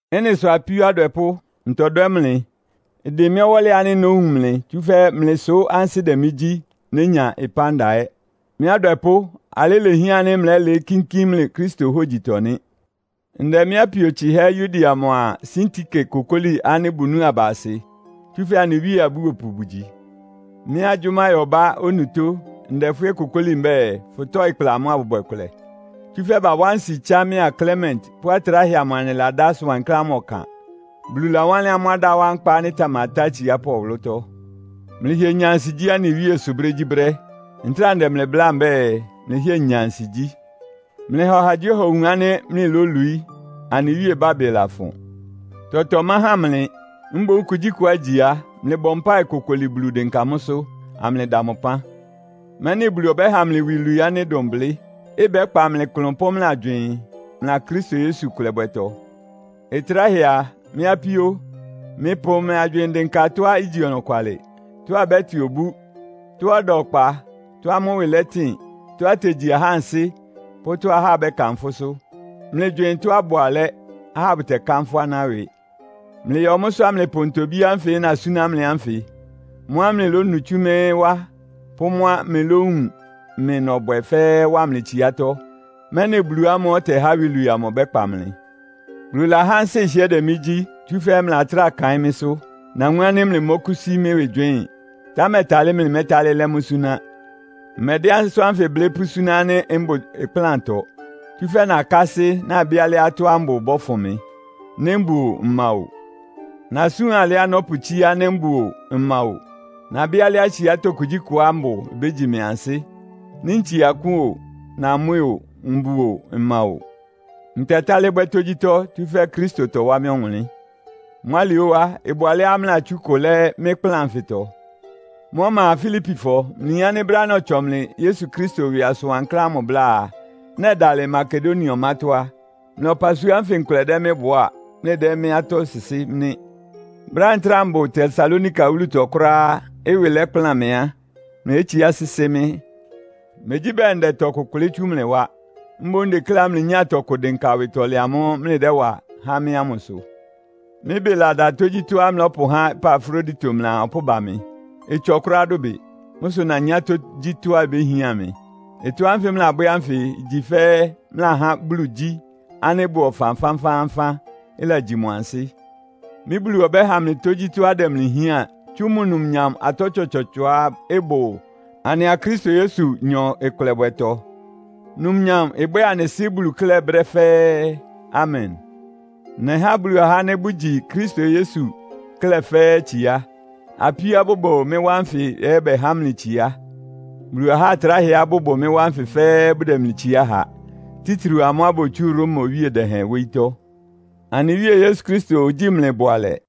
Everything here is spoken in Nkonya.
Ɩ́nɩ sʋ apíó adwɛpʋ́, ntɔdwɛ́ mlɩ. Ɩdɩn mɩ́ ɔwɔ́lɩ ánɩ́ nówun mlɩ, tsúfɛ́ mlɩ sʋ ansɩ́ dɛ mɩ́ gyí, nénya ɩpánda ɛ́! Mɩ́ adwɛpʋ́, alɩ ilehián ánɩ́ mlɛ́lɩɩ́ kínkín mlɩ Kristo hógyitɔ nɩ́. Ndɛ mɩ́ apio tsɩhɛ́ Euodia mʋa Sintike kokóli ánɩ́ bʋnúu aba asɩ, tsúfɛ́ anɩ Wíe abúopʋ bʋgyi. Mɩ́ agyʋ́máyɔbá onutó, ndɛ fʋ́ ɛ́ kókoli mbɛ́ɛ, fʋtɔ́ɩ kpla amʋ́ abʋbwɛ kʋlɛ. Tsúfɛ́ bawá nsi tsá mɩ́a Klement pʋ́ atráhɛ amʋ anɩladá asʋn wankláán ámʋ ɔkan. Bulu lawánlɩ́n amʋ́ adá wá nkpa ánɩ́ ɩtamatá atsiápʋ́ ɔwʋlʋ́tɔ́. Mlɩhɩɛ nya ansigyí anɩ Wíe sʋ brégyíbrɛ́! Ntráa ndɛ mlɩ bláa mbɛ́ɛ, mlɩhɩ́ɛ nya ansigyí! Mlɩha ɔhagyíɔha owun ánɩ́ mlɩlólwií. Anɩ Wíe ɩbábɩ lafʋn. Tɔtɔ ɩmáhan mlɩ. Mboún kugyíkʋá igyi á, mlɩbɔ mpáɩ kokoli Bulu dɩnka mʋ́sʋ́, amlɩda mʋ ɩpán. Mɛ́nɩ Bulu ɔbɛ́ha mlɩ iwilwii ánɩ́ ɩdʋn blɩ́, ɩbɛ́kpa mlɩ klʋn pʋ́ mlɩ agywɩɩn, mlɩa Kristo Yesu ɩkʋlɛbwɛtɔ. Ɩtráhɛ a, mɩ́ apíó, mlɩpʋ mlɩ agywɩɩn dɩnka tɔ́á igyi ɔnɔkwalɩ, tɔ́á ɩbɛ́tɩ obú, tɔ́á ɩda ɔkpa, tɔ́á mʋ́ ɩwɩ lɛtɩn, tɔ́á itegyi ahá ansɩ́ pʋ́ tɔ́á ahá bɛ́kanfʋ́sʋ́. Mlɩgywɩɩn tɔ́á ɩbʋ alɛ́, ahá bʋtɛkanfʋ́ aná ɩwɩ. Mlɩyɔ mʋ́sʋ́ amlɩpʋ ntobí ánfɩ nasúná mlɩ ánfɩ, mʋ́á mlɩlónu tsú mɩ́ wá pʋ́ mʋ́a mlɩlówun mɩ nɔbwɛ fɛ́ɛ́ wa mlɩ tsiátɔ́, mɛ́nɩ Bulu ámʋ́ʋ́ ɔtɛhá iwilwii amʋ ɔbɛ́kpa mlɩ. Bulu lahá ansɩ́ ɩhɩ́ɛ́ dɛ mɩ́ gyí, tsúfɛ́ mlɩlatráa kaɩ́n mɩ́sʋ́. Nawun ánɩ́ mlɩmɔ́kʋ́sí mɩ́ ɩwɩ gywɩɩ́n, támɛ talɩ́ mlɩmɛ́talɩ́ lɛ́ mʋ́ súná. Mmɛdɛ́ asʋ́n ánfɩ blɩ́ pʋ́súná ánɩ́ mbʋ ɩkplántɔ, tsúfɛ́ nakásɩ́, nabɩ́ alɩá tɔ́á mbʋ ɩbɔ́fʋn mɩ, nɩ́ mbʋ óó, mma óó! Nasúan alɩá nɔ́pʋtsíá nɩ́ mbʋ óó, mma óó. Nabɩ́ alɩá tsiátɔ́ kugyíkʋtɔá mbʋ ibégyi mɩ ansɩ́. Nɩ́ ntsie akʋ́n o, namwɛ́ o, mbʋ o, mma o. Ntɛtálɩ́ bwɛ́ tógyítɔ́, tsúfɛ́ Kristo tɔwá mɩ́ ɔwʋnlɩ́n. Mʋ́ alɩ óó á, ɩbʋ alɛ́á mlɩlatsú ɩkʋ lɛ́ mɩ́ ɩkplán anfɩtɔ. Mʋ́ ɔma a, Filipifɔ, mlɩyin ánɩ́ brɛ́á nɔtsɔ mlɩ Yesu Kristo ɩwɩ asʋn wankláán ámʋ bláa, nɛdalɩ Makedonia ɔmátɔ́ á, mlɩ ɔpasua ánfɩ nkʋlɛ dɛ́ mɩ́ bʋá, mlɩdɛ́ mɩ́ atɔ́ sɩsɩ́ nɩ́. Brɛ́á ntráa mbʋ Tesalonika wúlutɔ kʋ́ráá, ɩwɩ lɛ́kplan mɩ á, mlɩlétsiá sɩ́sɩ́ mɩ́. Megyí bɛɛ ndɛ tɔkʋ kʋlɩ́ tsú mlɩ wá. Mboún ndekléá mlɩnyá tɔkʋ dɩnka awɩtɔlɛ amʋ́ʋ́ mlɩdɛ́wa há mɩ́ ámʋsʋ. Mɩ́ ɩbɩ lada tógyítɔ́á mlɩlɔ́pʋhá Epafrodito mlɩaa ɔpʋ́ʋ ba mɩ. Ɩtsɔ kʋ́ráá dʋbɩ. Mʋ́ sʋ nanyá tógyítɔ́á ibéhián mɩ. Ɩtɔ́ ánfɩ mlɩlabwɛ́ ánfɩ igyi fɛ́ mlɩlahá Bulu igyí ánɩ́ ɩbʋ ɔfan fánfáánfán, ɩlagyi mʋ ansɩ́. Mɩ́ Bulu ɔbɛ́ha mlɩ tógyítɔ́á ɩdɛ mlɩ hián tsú mʋ numnyam atɔ́ tsɔtsɔɔtsɔá ɩbʋ anɩa Kristo Yesunyɔ ɩkʋlɛbwɛtɔ. Numnyam ɩbwɛ́ɛ anɩ Sɩ́ Bulu klɛ́ brɛ́ fɛ́ɛ́. Amen! Nɛhá Bulu ahá ánɩ́ bʋgyi Kristo Yesu klɛ́ fɛ́ɛ́ itsiá. Apíóá bʋbʋ mɩ́ wá nfɩ ɛ́ bɛhá mlɩ itsiá. Bulu ahá atráhɛá bʋbʋ mɩ́ wá nfɩ fɛ́ɛ́ bʋdɛ mlɩ itsiá ha. Títriu amʋ́á botsú Roma owíe dɛhɛn wóyítɔ́. Anɩ Wíe Yesu Kristo ogyíi mlɩ bʋalɛ.